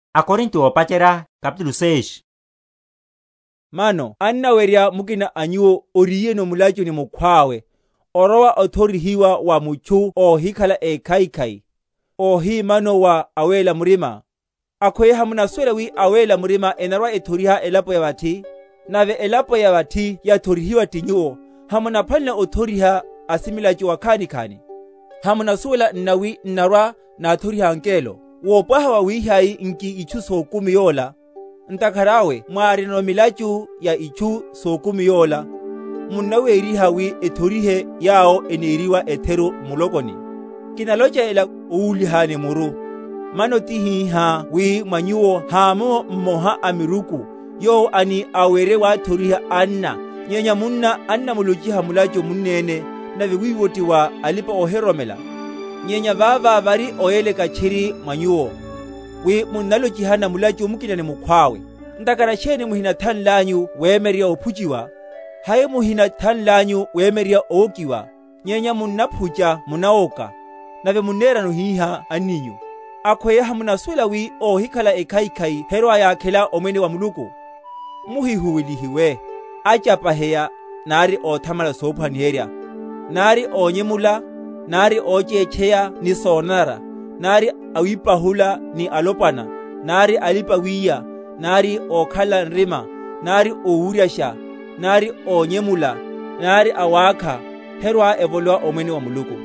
Mathoriheryo a milachu véri va anna. Mano annawerya mukina a nyuwo, oriyeno mulachu ni mukhwawe, orowa othorihiwa wa mutchu óhikhala ékhaikhai, ohi mano wa awéla murima? Akhweya hamunasuwela wi awéla murima enarwa‐ethoriha elapo ya vathi? Nave elapo ya vathi yathorihiwa ti nyuwo, hamunaphwanelela othoriha asimilachu akhanikhani? Hamunasuwela nna wi n’narwa‐náthoriha angelo? wopwaha wawihai nki itchu sokumi yola? Ntakhara awe mwárinono milachu ya itchu sokumi yola, munnawériha wi ethorihe yawo eneriwa etheru m’mulokoni? Kinalocha ela owúlihani muru. Mano tihihá wi mwa nyuwo hamomo mmoha amiruku, yowo ani awerye wathoriha anna, nyenya munna annamulochiha mulachu munneni, nave wiwo ti wa alipa‐ohiroromela? Nyenya vavo vari oyeleka tchiri mwa nyuwo, wi munnalochihana mulachu mukina ni mukhwawe. Ntakhara sheni muhinathanlanyu wemyererya ophuchiwa? hai muhinathanlanyu wemyererya owokiwa? Nyenya munnaphucha munawoka, nave munnerano hihá anninyu. Akhweya hamunasuwela wi óhikhala ekhaikhai herwa‐yakhela omwene wa Muluku? Muhihuwelihiwe; achapaheya, nari óthamala sophwaniherwa, nari ónvemula, nari óchétcheya ni sonanara, nari awípahula ni alopwana, nari alipa‐wiya, nari ókhalela nrima, nari ówuryasha, nari ónyemula, nari awákha, herwa‐evolowa omwene wa Muluku.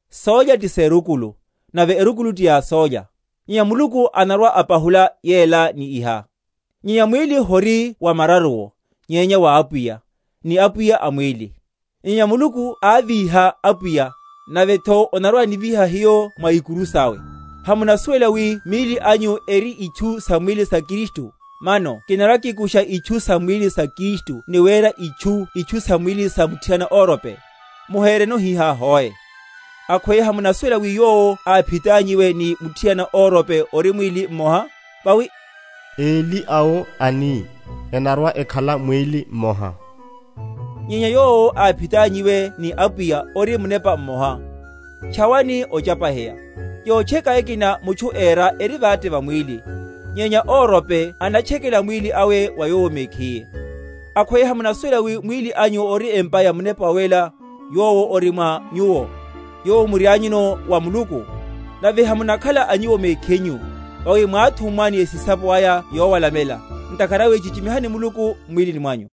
Sólya ti serukulu, nave erukulu ti ya sólya; nyenya Muluku anarwa‐apahula yela ni iha. Nyenya mwíli hori wa mararuwo, nyenya wa Apwiya, ni Apwiya a mwíli; nyenya Muluku ávíha Apwiya, navetho anarwa‐anivíha hiyo mwa ikuru sawe. Hamunasuwela wi míli anyu eri itchu sam’mwílini sa Kristu? Mano kinarwa‐kikusha itchu sam’mwílini sa Kristu ni wera itchu itchu sam’mwílini sa muthiana órope? Muhereno hihá hoe. Akhweya hamunasuwela wi yowo aphitanyiwe ni muthiana órope ori mwíli mmoha? Vawi, eli awo, ani, enarwa‐ekhala mwíli mmoha. Nyenya yowo aphitanyiwe ni Apwiya ori munepa mmoha. Tchawani ochapaheya. Yotcheka ekina mutchu éra eri vate va mwíli; nyenya órope anatchekela mwíli awe wa yowo mekhiye. Akhweya hamunasuwela wi mwíli anyu ori empa ya Munepa Wawéla, yowo ori mwa nyuwo, yowo murianyuno wa Muluku? Nave hamunakhala a nyuwo mekhinyu. Vawi mwáthummwa ni esisapo aya yowalamela: ntakhara awe chichimihani Muluku m’mwílini mwanyu.